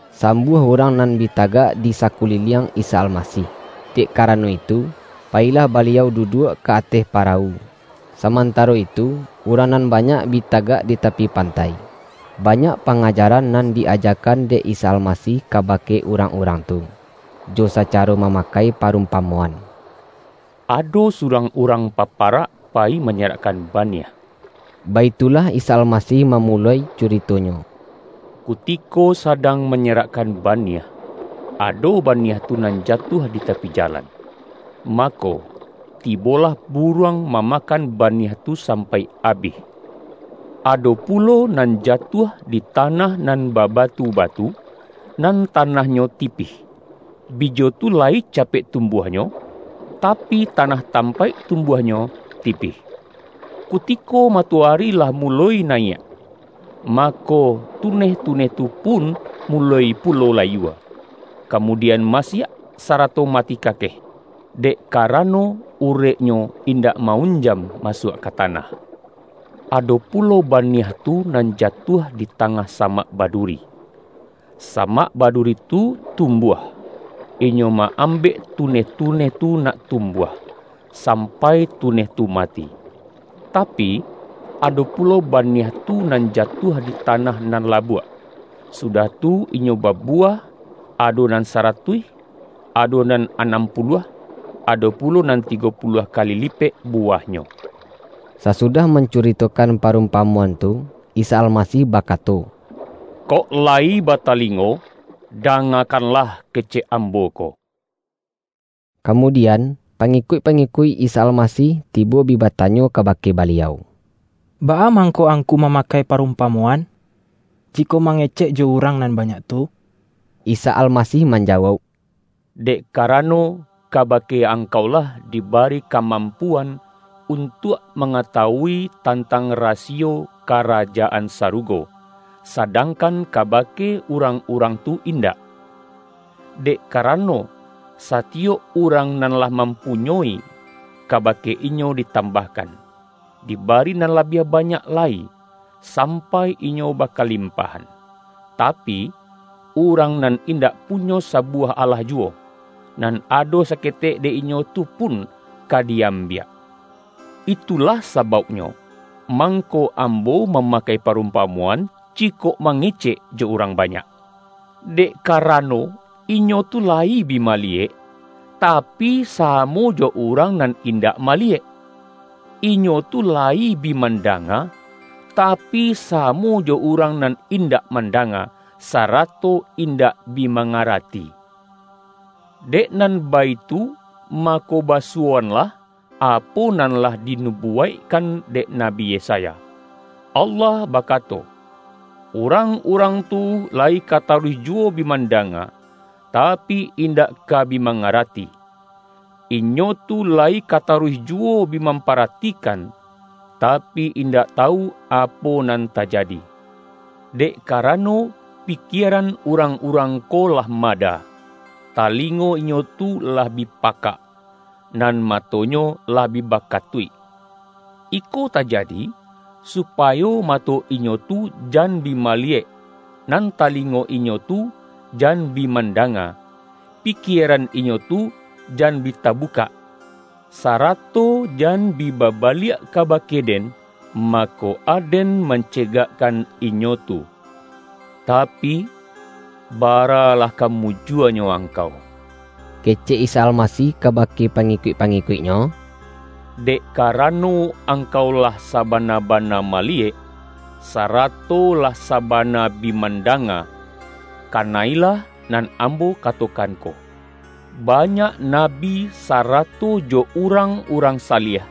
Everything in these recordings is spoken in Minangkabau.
Sambuah urang nan bi tagak di sakuliliang Isa Almasih, dek karano itu, payilah Baliau duduak ka ateh parawu, sa-mantaro itu urang nan banyak bi ta-gak di tapi pantai. Banyak panga-jaran nan di-ajakan dek Isa Almasih kabake urang-urang tu, jo sacaro ma-makai parumpamoan.”Ado surang urang paparak payi manyerakkan baniah,” baitulah Isa Almasih mamuloi curito-Nyo. ”Kutiko sadang manyerakkan baniah, ado ba-niah tu nan jatuah di tapi jalan. Mako, tibolah buruang mamakan baniah tu sampai abih. Ado pulo nan jatuah di tanah nan babatu-batu, nan tanah-nyo tipih. Bijo tu layi capek tumbuah-nyo, tapi tanah tampaik tumbuahnyo tipih. Kutiko matoari lah muloi na-yiak, mako, tuneh-tuneh tu pun muloi pulo layua, kamudian masiak, sarato mati kakeh, dek karano ureknyo in-dak ma-unjam masuak ka tanah. Ado pulo baniah tu nan jatuah di tangah samak baduri. Samak baduri tu tum-buah, inyo ma-ambek tuneh-tuneh tu nak tumbuah, sampai tuneh tu mati. Tapi, ado pulo baniah tu nan jatuah di tanah nan labuak, sudah tu inyo babuwah; ado nan saratuih, ado nan anam puluah, ado pulo nan tigo pu-luah kali lipek buwahnyo.” Sasudah mancuritokan parumpa-moan tu, Isa Almasih bakato,”Kok lai batalingo, dangakanlah kecek Ambo ko!” Kamudian, pangikuik-pangikuik Isa Almasih tibo bi batanyo kabake Baliau,”Baa mangko Angku mama-kai parumpamoan, jikok mangecek jo urang nan banyak tu?” Isa Almasih manjawauk,”Dek ka-rano, kabake angkau lah dibari ka-rnampuan untuak mangatawui tantang rasiyo Karajaan Sarugo, sadangkan kabake urang-urang tu indak. Dek karano, satiyok urang nan lah mam-punyoi, kabake inyo ditambahkan, dibari nan labiah banyak lai, sampai inyo bakalimpahan. Tapi, urang nan indak punyo sabuwah alah juwo, nan ado saketek dek inyo tu pun ka di-am-biak. Itulah sabauknyo mangko Am-bo mamakai parumpamoan, jikok ma-ngecek jo urang banyak, dek karano, inyo tu layi bi maliyek, tapi, samo jo urang nan indak maliyek; inyo tu la-yi bi mandanga, tapi, samo jo urang nan indak mandanga, sarato indak bi mangarati. Dek nan baitu, mako ba-suwoanlah, apo nan lah dinubuwaik-kan dek Nabi Yesaya, ’Allah bakato: Urang-urang tu layi ka taruih juwo bi mandanga, tapi, indak ka bi mangarati; inyo tu layi ka taruih juwo bi mamparatikan, tapi, indak tawu, apo nan tajadi. Dek karano, pikieran urang-urang ko lah mada, talingo inyo tu lah bi pakak, nan matonyo lah bi bakatuik. Iko tajadi, supayo mato inyo tu jan bi maliyek, nan talingo inyo tu jan bi mandanga, pikieran inyo tu jan bi tabukak, sarato jan bi babaliak kabake Den, mako, Aden mancegakkan inyo tu.’” ”Tapi, baralah ka mujuanyo ang-kau,” kecek Isa Almasih kabake pa-ngikuik-pangikuik-Nyo,”dek karano, angkau lah sabana-bana maliyek, sarato lah sabana bi mandanga. Kana-ilah nan Ambo katokan ko, banyak nabi sarato jo urang-urang sa-liah,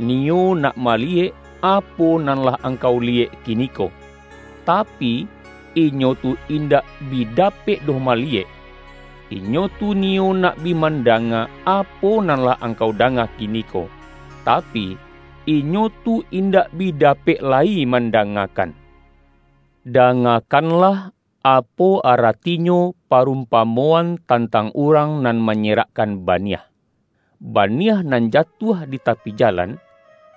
niyo nak maliyek, apo nan lah angkau liyek kiniko, tapi, inyo tu in-dak bi dapek doh maliyek. Inyo tu ni-yo nak bi mandanga, apo nan lah ang-kau danga kiniko, tapi, inyo tu indak bi dapek lai mandangakan.” ”Dangakanlah, apo aratinyo pa-rumpamoan tantang urang nan manyerakkan baniah. Baniah nan jatuah di tapi jalan,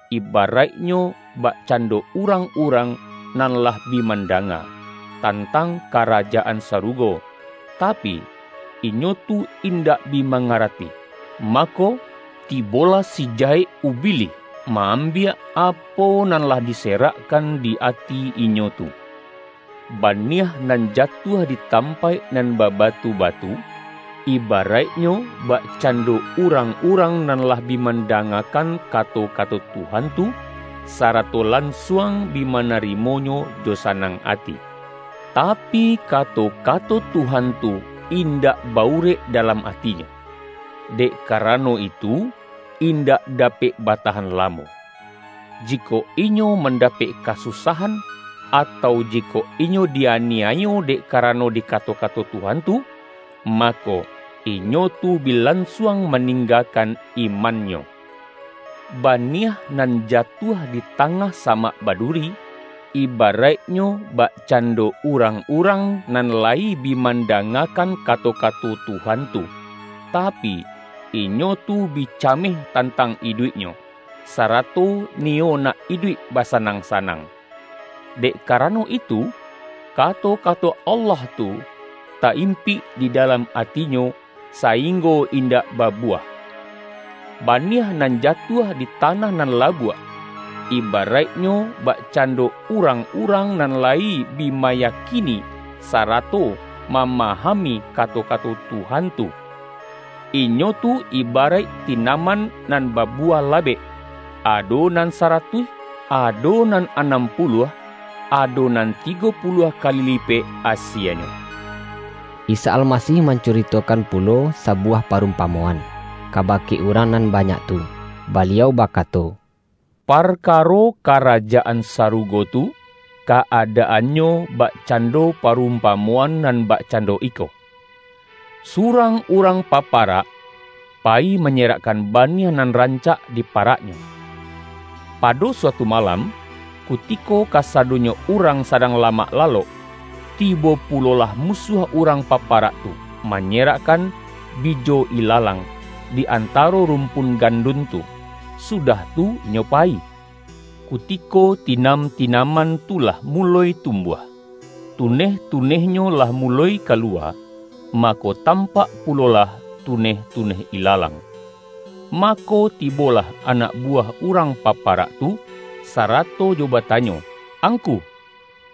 ibaraiknyo, bakcando urang-urang nan lah bi mandanga, tantang Karajaan Sarugo, tapi, inyo tu indak bi mangarati. Mako, tibolah si Jahek (ubilih) ma-ambiak, apo nan lah diserakkan di ati inyo tu. Baniah nan jatuah di tampaik nan babatu-ba-tu, ibaraiknyo, bakcando urang-urang nan lah bi mandangakan kato-kato Tuhan tu, sarato lansuang bi mana-rimonyo jo sanang ati. Tapi, kato-kato Tuhan tu indak ba-urek dalam atinyo, dek karano itu, indak dapek batahan lamo. Jikok inyo mandapek kasusahan, atau jikok inyo di-aniayo dek karano di kato-kato Tuhan tu, ma-ko, inyo tu bi lansuang maninggakan imannyo. Baniah nan jatuah di ta-ngah samak baduri, ibaraiknyo, bak-cando urang-urang nan layi bi manda-ngakan kato-kato Tuhan tu, tapi, inyo tu bi cameh tantang iduiknyo, sara-to niyo nak iduik basanang-sanang. Dek karano itu, kato-kato Allah tu, ta-impik di dalam atinyo, sainggo indak babuwah. Baniah nan jatuah di ta-nah nan labuak, ibaraiknyo, bakcan-do urang-urang nan layi bi mayakini sarato mamahami kato-kato Tuhan tu. Inyo tu ibaraik tinaman nan ba-buwah labek, ado nan saratuih, ado nan anam puluah, ado nan tigo pu-luah kali lipek asienyo.” Isa Almasih mancuritokan pulo sa-buwah parumpamoan, kabake urang nan banyak tu, Baliau bakato,”Parka-ro Karajaan Sarugo tu, ka-adaannyo bakcando parumpamoan nan bakcan-do iko: Surang urang paparak, payi manyerakkan baniah nan rancak di paraknyo. Pado suatu malam, ku-tiko kasadonyo urang sadang lamak lalok, tibo pulolah musuah urang pa-parak tu, manyerakkan bijo ilalang, di antaro rumpun gandun tu, sudah tu inyo payi. Kutiko tinam-tinaman tu lah muloi tumbuah, tuneh-tunehnyo lah muloi kaluwa, mako, tampak pu-lolah tuneh-tuneh ilalang. Mako, ti-bolah anak buwah urang paparak tu, sarato jo batanyo, ’Angku,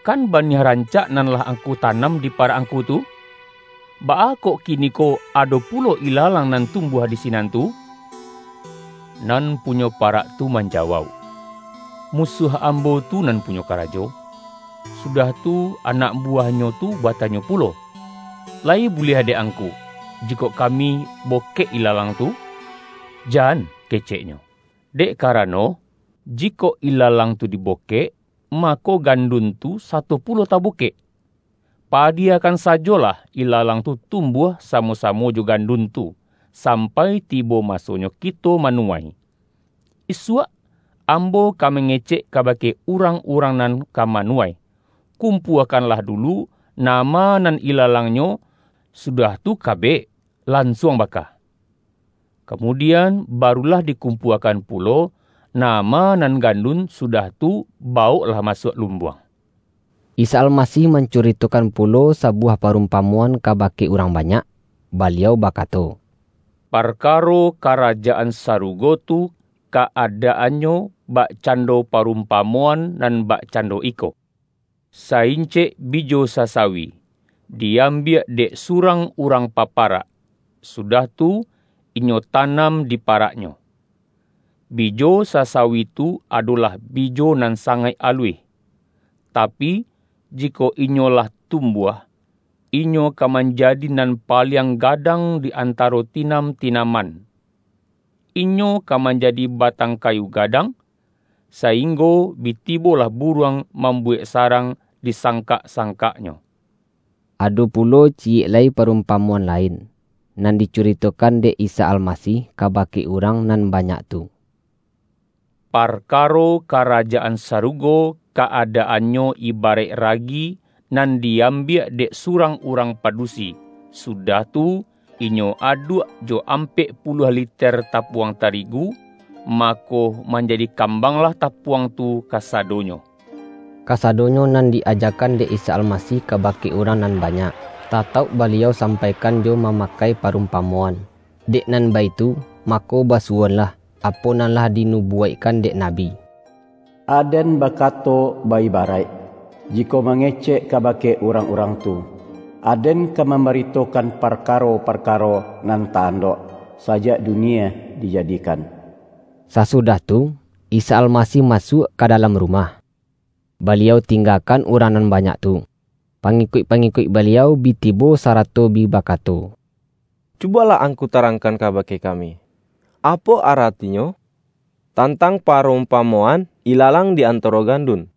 kan baniah rancak nan lah angku tanam di parak angku tu? Baa kok kiniko ado pulo ila-lang nan tumbuah di sinan tu?' Nan punyo parak tu manjawauk, ’Musuah ambo tu nan punyo karajo.’ Sudah tu, anak buwahnyo tu batanyo pulo, ’La-yi buliah dek angku, jikok kami bokek ilalang tu?' ’Jan.’ keceknyo, ’Dek ka-rano, jikok ilalang tu dibokek, mako, gandun tu sato pulo tabokek. Pa-diyakan sajolah ilalang tu tumbuah samo-samo jo gandun tu, sampai ti-bo masonyo kito manuwai. Isuak am-bo ka mangecek kabake urang-urang nan ka manuwai: Kumpuakanlah du-lu nama nan ilalangnyo, sudah tu ka-bek, lansuang baka. Kamudian, ba-rulah dikumpuakan pulo nama nan gandun, sudah tu, bawoklah masuak lumbuang.’” Isa Almasih mancuritokan pulo sabuwah parumpamoan kabake urang banyak, Baliau bakato,”Parkaro Ka-rajaan Sarugo tu, ka-adaannyo bak-cando parumpamoan nan bakcando iko: Sa-incek bijo sasawi, di ambiak dek surang urang paparak, sudah tu, inyo tanam di paraknyo. Bijo sasa-wi tu adolah bijo nan sangaik aluih. Tapi, jikok inyo lah tumbuah, inyo ka manjadi nan paliang gadang di antaro tinam-tinaman. Inyo ka manjadi ba-tang kayu gadang, sainggo bi tibo lah buruang mambuwek sarang di sang-kak-sangkaknyo.” Ado pulo ciyek lai parumpa-moan lain, nan dicuritokan dek Isa Almasih kabake urang nan banyak tu.”Parkaro Karajaan Sarugo, ka-adaan-nyo ibaraik ragi, nan di ambiak dek surang urang padusi, sudah tu, inyo aduak jo ampek puluah liter tapuang tarigu, mako, manjadi kambanglah tapuang tu kasadonyo!” Kasadonyo nan di-ajakan dek Isa Almasih kabake urang nan banyak, tatauk Baliau sampaikan jo mama-kai parumpamoan. Dek nan baitu, mako basuwoanlah, apo nan lah di-nubuwaikkan dek nabi,”Aden bakato ba-ibaraik, jikok mangecek kabake urang-urang tu; Aden ka mambaritokan parkaro-parkaro nan ta-andok, sajak dunie dijadikan.” Sasudah tu, Isa Almasih masuak ka dalam rumah, Baliau tinggakan urang nan banyak tu. Pangikuik-pangikuik Baliau bi tibo sarato bi bakato,”Cu-bolah Angku tarangkan kabake kami, apo aratinyo, tantang parumpamoan ilalang di antaro gandun.”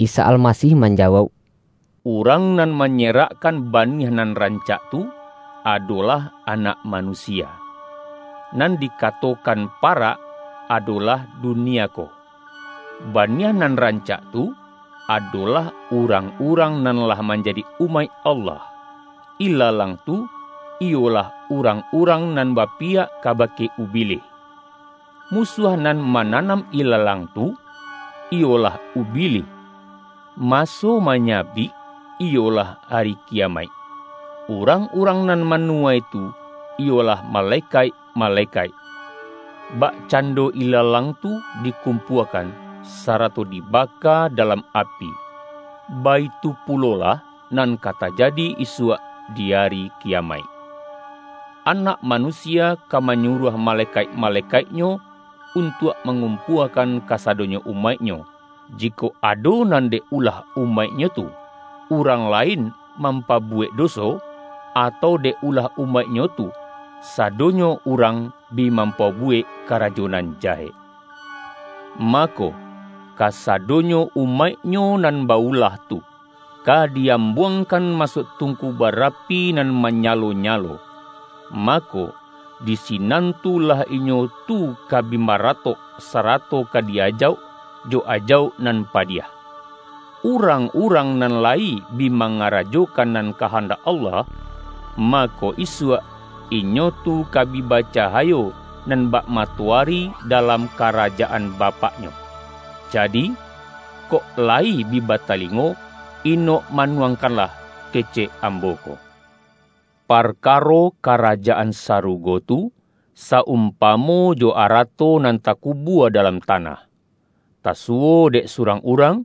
Isa Almasih manjawauk,”Urang nan manyerakkan baniah nan rancak tu, adolah Anak Manusia. Nan dika-tokan parak, adolah dunia ko. Baniah nan rancak tu, adolah urang-urang nan lah manjadi umaik Allah. Ilalang tu, iyolah urang-urang nan bapiyak kaba-ke Ubilih. Musuah nan mananam ilalang tu, iyolah Ubilih. Maso ma-nyabik, iyolah Ari Kiyamaik, urang-urang nan manuwai tu, iyolah male-kaik-malekaik. Bakcando ilalang tu dikumpuakan, sarato dibaka dalam api, baitu pulolah, nan ka tajadi isuak di Ari Kiyamaik. Anak Manusia ka manyuruah malekaik-malekaik-Nyo, untuak mangumpuakan kasadonyo umaik-Nyo, jikok ado nan dek ulah umaik-Nyo tu, urang lain mampabu-wek doso, atau, dek ulah umaik-Nyo tu, sadonyo urang bi mampabuwek karajo nan jahek. Mako, kasadonyo umaik-Nyo nan ba-ulah tu, ka di-am-buangkan masuak tungku barapi nan manyalo-nyalo; mako, di sinan tu lah inyo tu ka bi maratok, sarato ka di ajauk, jo ajauk nan padiah. Urang-urang nan layi bi mangarajokan nan kahandak Allah, mako, isuak inyo tu ka bi bacahayo nan bak matoari da-lam Karajaan Bapak-nyo. Jadi, kok la-yi bi batalingo, inok manuangkanlah kecek Ambo ko!” ”Parkaro Karajaan Sarugo tu, sa-umpamo jo arato nan takubua dalam tanah, tasuwo dek surang urang,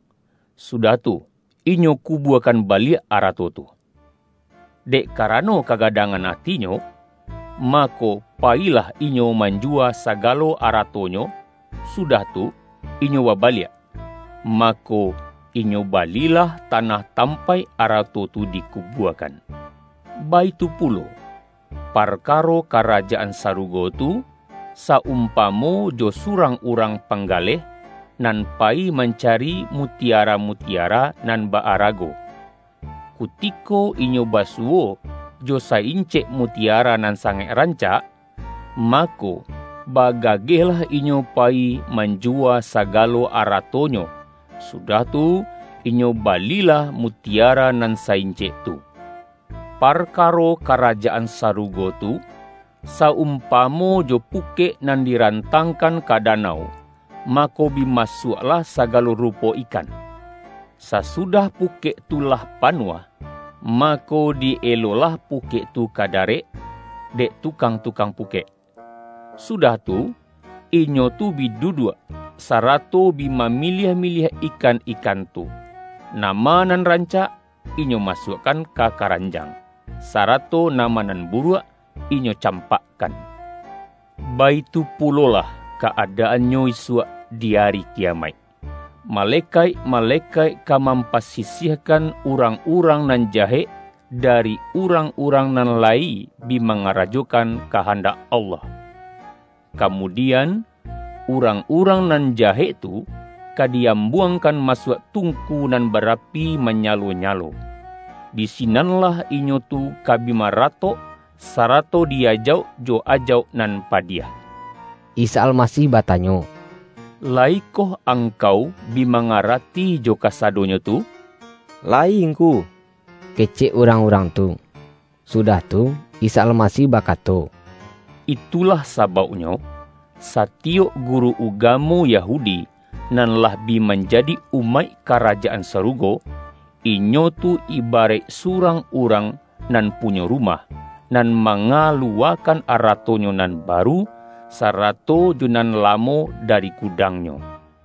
su-dah tu, inyo kubuakan baliak arato tu. Dek karano kagadangan atinyo, ma-ko, payilah inyo manjuwa sagalo ara-tonyo, sudah tu, inyo babaliak, mako, inyo balilah tanah tampaik arato tu dikubuakan.” ”Baitu pulo, parkaro Karajaan Sa-rugo tu, sa-umpamo jo surang urang panggaleh, nan payi mancari muti-ara-mutiara nan ba-arago. Kutiko inyo basuwo jo sa-incek mutiara nan sangaik rancak, mako, bagagehlah inyo payi manjuwa sagalo aratonyo, sudah tu, inyo balilah mutiara nan sa-incek tu.” ”Parkaro Karajaan Sarugo tu, sa-umpamo jo pukek nan dirantangkan ka danau, mako, bi masuaklah saga-lo rupo ikan. Sasudah pukek tu lah panuah, mako, di-elolah pukek tu ka darek, dek tukang-tukang pukek. Su-dah tu, inyo tu bi duduak, sarato bi mamiliah-miliah ikan-ikan tu: Nama nan rancak, inyo masuakkan ka ka-ranjang, sarato nama nan buruak, inyo campakkan. Baitu pulolah ka-adaan-nyo isuak di Ari Kiyamaik, malekaik-malekaik ka mampasisiahkan, urang-urang nan jahek, dari urang-urang nan lai bi mangarajokan kahandak Allah. Kamudian, urang-urang nan jahek tu, ka di-ambuangkan masuak tung-ku nan barapi manyalo-nyalo. Di si-nanlah inyo tu ka bi maratok, sarato di-ajauk jo ajauk nan padiah.” Isa Almasih batanyo,”Layikoh angkau bi mangarati jo kasadonyo tu,?””Layi Ngku!” kecek urang-urang tu. Sudah tu, Isa Almasih bakato,”Itu-lah sabauknyo, satiyok guru ugamo Ya-hudi, nan lah bi manjadi umaik Ka-rajaan Sarugo, inyo tu ibaraik surang urang nan punyo rumah, nan manga-luwakan aratonyo nan baru, sarato jo nan lamo dari gudangnyo.”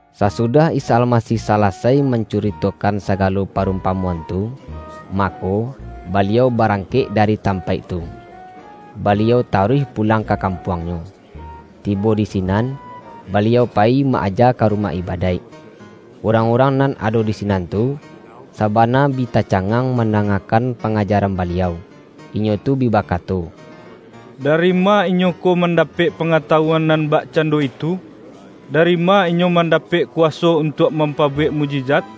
Sasudah Isa Almasih salasai man-curitokan sagalo parumpamoan tu, ma-ko, Baliau barangkek dari tampaik tu, Baliau taruih pulang ka kampuang-Nyo. Tibo di sinan, Baliau payi ma-aja ka rumah ibadaik, urang-urang nan ado di sinan tu, sabana bi tacangang mandangakan pangajaran Baliau. Inyo tu bi bakato,”Dari ma Inyo ko man-dapek pangatawuan nan bakcando itu? Dari ma Inyo mandapek kuwaso untuak mampabuwek mukjizat?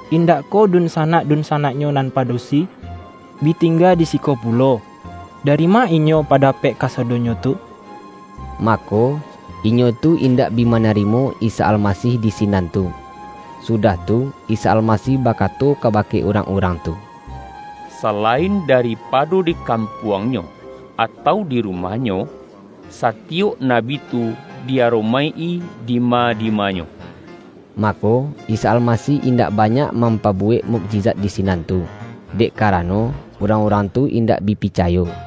Indak koh dun-sanak-dunsanak-Nyo nan padusi, bi tingga di siko pulo? Dari ma Inyo pa-dapek kasadonyo tu?” Mako, inyo tu indak bi manarimo Isa Almasih di sinan tu. Sudah tu, Isa Almasih baka-to kabake urang-urang tu,”Salain da-ripado di kampuangnyo, atau di ru-mahnyo, satiyok nabi tu di aromaik-i dima-dimanyo.” Mako, Isa Almasih indak banyak mampabuwek mukjizat di sinan tu, dek karano, urang-urang tu indak bi picay o.